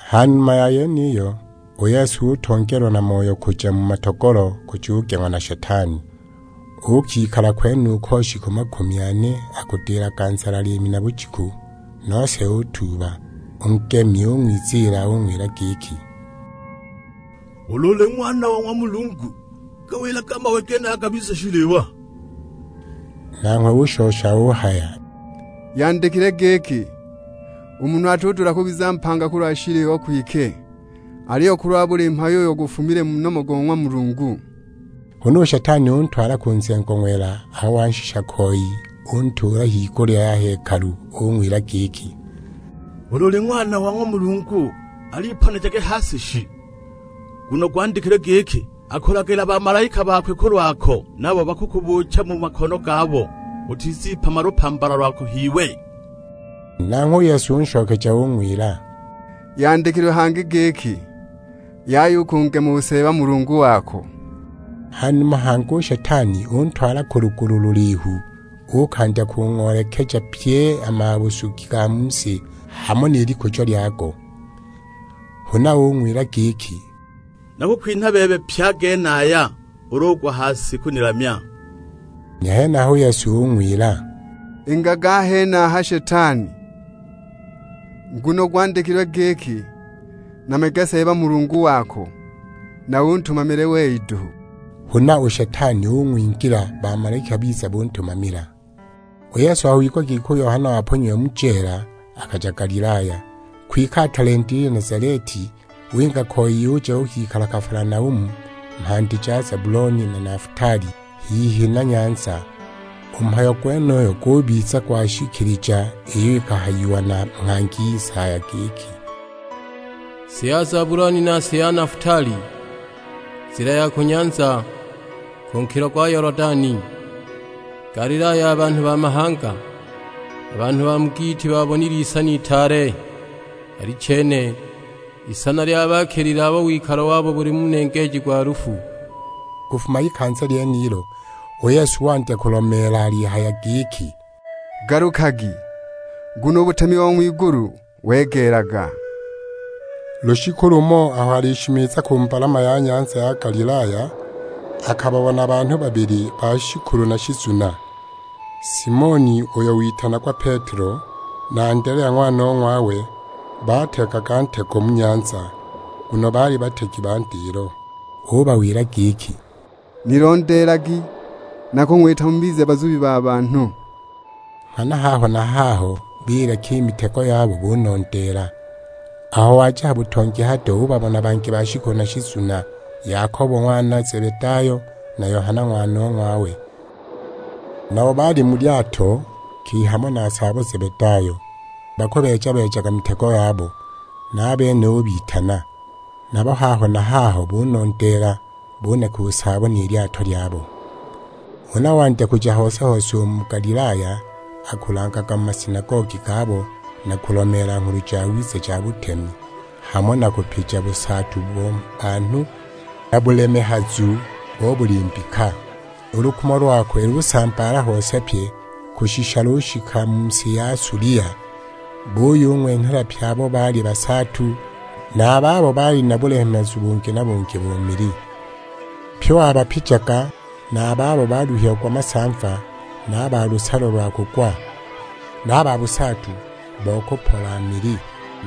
Ha numa ya yeniyo, u Yesu utongeelwa na Moyo kuja ku matogolo, kujugeng'wa na Shetani. Uukikala kwenuko shiku makumi ane, akudilaga nzala liimi na bujiku; nose utuuba! U ngemi ung'wiziila ung'wila giki, "Ulu uli Ng'wana wa ng'wa Mulungu, gawilage a mawe genaya gabize shiliwa." Nanghwe ushosha uhaya, "Yandikilwe giki, 'U munhu atudula kubiza mpanga kulwa shiliwa kwike, aliyo kulwa buli mhayo uyo gufumile mu nomo go ng'wa Mulungu.' " Huna u Shetani untwala ku nzengo ng'wela, aho wanshisha koi untuula higulya ya hekalu. Ung'wila giki, "Ulu uli Ng'wana wa ng'wa Mulungu al'iponejage ha si shi; nguno gwandikilwe giki, 'Akulagila bamalaika bakwe kulwako, nabo bakukubuucha mu makono gabo, utizipama lupambala lwako h'iwe!' " Nanghwe u Yesu unshokeja ung'wila, "Yandikilwe hangi giki, 'Yaya u kungema u Seeba Mulungu wako.' " Ha numa hangi u Shetani untwala ku lugulu lulihu; uukandya kung'oolekeja pye a mabusugi ga mu si, hamo ni likujo lyago. Huna ung'wila giki, "Nakukwinha bebe pye a genaya, ulu ugwa ha si kunilamya." A henaho u Yesu ung'wila, "Ingaga a henaha Shetani, nguno gwandikilwe giki, 'Namyage Seeba Mulungu wako, na untumamile wei duhu!' " Huna u Shetani ung'wingila, bamalaika biza kuntumamila. U Yesu aho wigwa giki u Yohana waponyiwe mu jeela, akaja Galilaya. Kwike atalendile i Nazaleti, winga koi uja uukikala Kafalanaumu, mhandi ja Zabuloni na Nafutali; hihi na nyanza. U mhayo gwenuyu gubiza gwashikilija iyo ihayiwe na nghangi Isaya; giki, "Si ya Zabuloni na si ya Nafutali, nzila ya ku nyanza, ku nkilo gwa Yolodani; Galilaya ya banhu ba mahanga. A banhu ba mu giiti baabonile isana itaale, alichene, isana lyabaakilile abo wikalo wabo buli mu nengeeji gwa lufu!" Kufuma ikanza lyenilo, u Yesu wandya kulomeela alihaya giki, "Galukagi, nguno u butemi bo ng'wigulu wegeelaga!" Lushiku lumo aho alishimiza ku mbalama ya nyanza ya Galilaya, akababona banhu babili ba shikulu na shizuna, Simoni uyo witanagwa Petelo, na Andelea ng'wanong'wawe; baategaga ntego mu nyanza, nguno baali bategi ba ndilo. Ubawila giki, "Nilondeelagi, nakung'wita mubize bazubi ba banhu." Nghana haho na haho bileka i mitego yabo bunondeela. Aho waja ha butongi hado, ubabona bangi babili ba shikulu na shizuna, Yakobo ng'wana Zebedayo, na Yohana ng'wanong'wawe. Nabo baali mu lyato hamo na saabo Zebedayo, bakubeeja-beejaga mitego yabo: na a bene ubitana. Nabo haho na haho bunondeela, buneka u saabo ni lyato lyabo. Huna wandya kuja hose-hose u mu Galilaya akulangaga mu masinagogi gabo, na kulomeela Nghulu Jawiza ja butemi, hamo na kupija busaatu bo banhu, na bulemehazu bo buli mbika. U lukumo lokwe lusambaala hose pye, kushisha lushika mu si ya Sulia. Buyung'wenhela pye abo baali basaatu, na a babo baali na bulemehazu bungi na bungi bo mili. Pye wabapijaga, na a babo baluhiagwa masamva, na a ba lusalo lwa kugwa, na a ba busaatu bo kupola mili.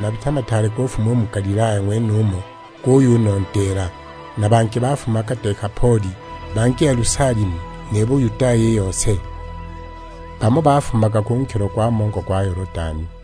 Mabita mataale kufuma u mu Galilaya ng'wenumo guyunondeela; na bangi bafumaga Dekapoli, bangi Yelusalemu, ni Buyudaya i yose. Bamo bafumaga ku nkilo gwa mongo gwa Yolodani.